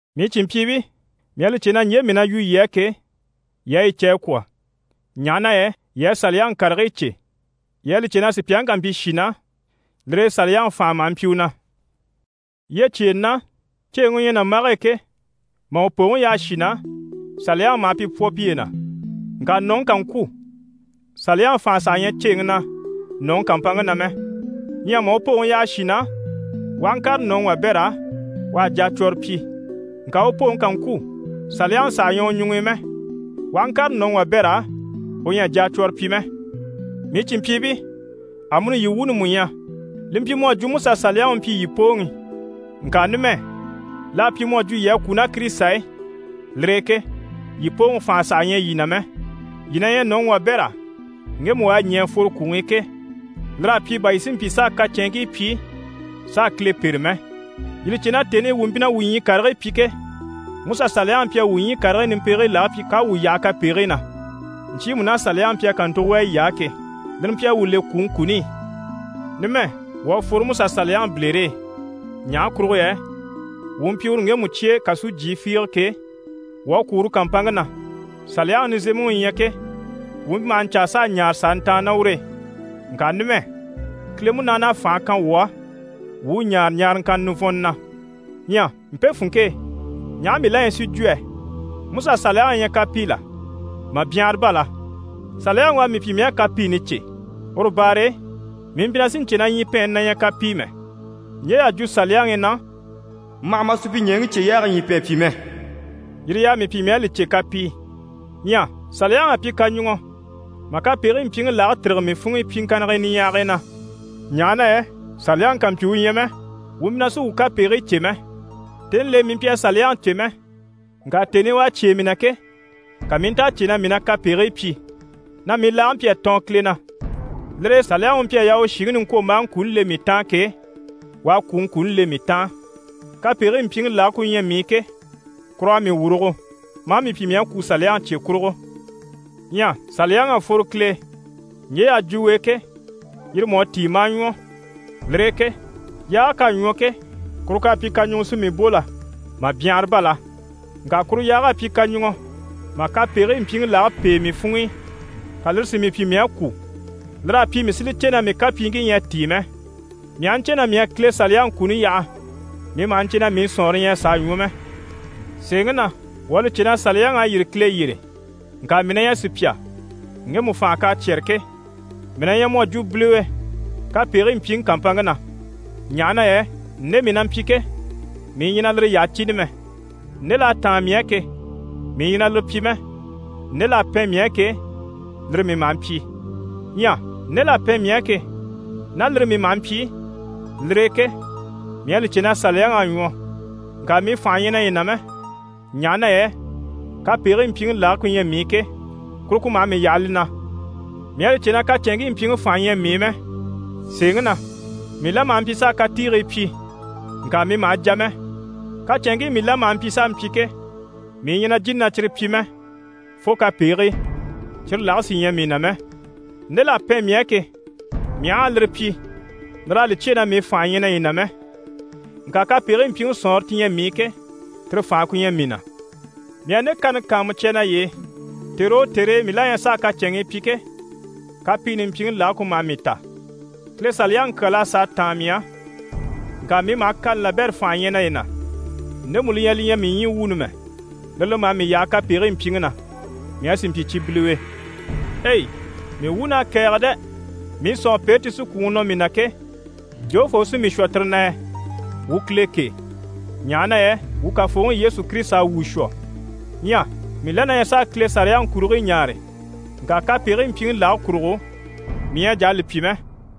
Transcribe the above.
Mii cìnmpyiibii, mii à li cè na ɲje mii na yu yii á ke, yii à yi cè a kwɔ̀, ɲaha na yɛ yii à saliyaŋi karigii cè. Yii à li cè na sùpyaŋi ká mpyi shì na, lire e saliyaŋi fànhe maha mpyi u na. Yyecyeenɛ na, ceeŋi u ɲyɛ nàmbage e ke, mà u pooŋi yaha shì na, saliyaŋi maha pi pwɔ piye na. Ŋka nɔ̀ŋi ká ŋkwû, saliyaŋi fànhe saha ɲyɛ ceeŋi na nɔ̀ŋi kàmpanŋa na mɛ. Ɲyɛ mà u pooŋi yaha shì na, u aha ŋkàre nɔ̀ŋi wabɛr'á, u à jacwɔrɔ pyi. Ŋka u pooŋi ká ŋkwû, saliyaŋi saha ɲyɛ u ɲuŋ'i mɛ, u aha ŋkàre nɔ̀ŋi wabɛr'á, u ɲyɛ a jacwɔrɔ pyi mɛ. Mii cìnmpyiibii, amuni yii wuuni mú ɲyɛ. Li mpyi mu à jwo MusaSaliyaŋi u mpyi yii pooŋi. Ŋka numɛ, l'à pyi mu à jwo yii à kwû ná Kirisita e. Lire e ke yii pooŋi fànhe saha ɲyɛ yii na mɛ. Yii na ɲyɛ nɔ̀ŋi wabɛr'á ŋgemu u à ɲɛ̀ a fworo kwùŋi i ke. Lir'à pyi bà yii si mpyi s'a kacɛnŋii pyi s'a Kile pêre mɛ. Yii li cè na tèni i wuu mpyi na wuu ɲyii karigii pyi ke, Musa Saliyaŋi mpyi a wuu ɲyii karigii nimpegigii lage pyi k'à wuu yaha kapegigii na, ɲcyiimu ná Saliyaŋi mpyi a kàntugo wà yiy'á ke. Lire mpyi a wuu le kwùŋi kuni i. Numɛ wuu à fworo Musa Saliyaŋi bilere e, ɲaha kurugo yɛ wuu mpyi uru ŋgemu cye e kasujyii fiige ke, wuu à kwû uru kàmpanŋke na. Saliyaŋi nizemɛŋi u ɲyɛ ke, wuu mpyi maha ɲcaa s'a ɲaare s'a ntàanni ná ur'e, ŋka numɛ, Kile Munaani à fànhe kan wuu á, wuu u ɲaare ɲaaraŋkanna nivɔnnɔ na. Ɲyɛ mpe funŋke e, ɲaha mii la ɲyɛ si jwo yɛ? MusaSaliyaŋi na ɲyɛ kapii la? Mà byanhara bá la! Saliyaŋi u à mii pyi mii à kapiini cè. Uru baare e, mii mpyi na sì n‑cè na ɲyipɛɛnni na ɲyɛ kapii mɛ. Ɲje y'à jwo Saliyaŋi i na: «Ma hà ma supyiɲɛɛŋi cyeyaage ɲyipɛɛn pyi mɛ» yire y'à mii pyi mii à li cè kapii. Ɲyɛ Saliyaŋi à pyi kaɲuŋɔ mà kapegigii mpyiŋi lage tîrige mii funŋ'i pyiŋkannigii niɲyahagii na. Ɲaha na yɛ Saliyaŋi kàmpyi u ɲyɛ mɛ, wuu mpyi na sí wuu kapegigii cè mɛ. Tèni l'e, mii mpyi a Saliyaŋi cè mɛ, ŋka tèni i u à cyêe mii na ke, ka mii i nta a cè na mii na kapegigii pyi, na mii laage mpyi a tɔɔn Kile na. Lire e Saliyaŋi u mpyi a yaa u shìŋi niŋkwombaaŋi kuni le mii taan ke, u à kwùŋi kuni le mii taan. Kapegigii mpyiŋi lage ku ɲyɛ mii i ke, kur'à mii wurugo, maa mii pyi mii à kwû Saliyaŋi cye kurugo. Ɲyɛ Saliyaŋi à fworo Kile e, ɲje y'à jwo u e ke, yire mú à tíi, maa ɲwɔ. Lire e ke yaage k'à ɲwɔ ke, kuru k'à pyi kaɲuŋɔ si mii bò la? Mà byanhara bá la! Ŋka kuru yaag'à pyi kaɲuŋɔ mà kapegigii mpyiŋi lage pêe mii funŋ'i, ka lire si mii pyi mii à kwû. Lir'à pyi mii si li cè na mii kapyiiŋkii ɲyɛ a tíi mɛ. Mii aha ɲcè na mii à Kile Saliyaŋi kuni yaha, mii maha ɲcè na mii sɔ̀nŋɔre ɲyɛ a sàa ɲwɔ mɛ. Sèeŋi na, wuu à li cè na Saliyaŋi à yîri Kile yyére, ŋka mii na ɲyɛ sùpya, ŋgemu fànha k'à cyɛ́rɛ ke. Mii na ɲyɛ mu à jwo biliwe kapegigii mpyiŋi kàmpanŋke na. Ɲaha na yɛ nde mii na mpyi ke, mii ɲyɛ na lire yyaha cìni mɛ. Nde l'à táan mii á ke, mii ɲyɛ na lire pyi mɛ, nde l'à pɛn mii á ke, lire mii maha mpyi. Ɲyɛ nde l'à pɛn mii á ke, ná lire mii maha mpyi, lire e ke, mii à li cè na Saliyaŋi à ɲwɔ. Ŋka mii fànha ɲyɛ naye na mɛ, ɲaha na yɛ kapegigii mpyiŋi lage ku ɲyɛ mii i ke, kuru ku maha mii yaha li na. Mii à li cè na kacɛnŋkii mpyiŋi fànha ɲyɛ mii i mɛ. Sèeŋi na, mii la maha mpyi s'a katiigii pyi, ŋka mii maha jà mɛ. Kacɛnŋkii mii la maha mpyi s'a mpyi ke, mii ɲyɛ na jìni na cyire pyi mɛ fo kapegigii, cyire lage sí ɲyɛ mii na mɛ. Nde l'à pɛn mii á ke, mii aha a lire pyi, lir'à li cyêe na mii fànha ɲyɛ naye na mɛ, ŋka kapegigii mpyiŋi sɔ̀nŋɔre ti ɲyɛ mii i ke, tire fànhe ku ɲyɛ mii na. Mii à nde kani kàanmucya naye e, tère o tère e mii la ɲyɛ s'a kacɛnŋii pyi ke, kapiini mpyiŋi lage ku maha mii ta. Kile Saliyaŋi kyal'à sàa táan mii á. Ŋka mii maha kani labɛrɛ fànha ɲya naye na, ndemu li ɲyɛ li ɲyɛ mii ɲyii wuuni mɛ. Lire li maha mii yaha kapegigii mpyiŋi na, mii a sì mpyi cyi biliwe. Ei! Mii wuun'à kɛ̀ɛge dɛ! Mii sɔ̀nŋɔpeere ti sí kwùŋi nɔ mii na ke, jofoo u sí mii shwɔ tire na yɛ? Wuu Kile kêe, ɲaha na yɛ wuu Kafooŋi Yesu Kirisita à wuu shwɔ. Ɲyɛ mii la na ɲyɛ s'a Kile Saliyaŋi kurigii ɲaare, ŋka kapegigii mpyiŋi lage kurugo, mii ɲyɛ a jà a li pyi mɛ.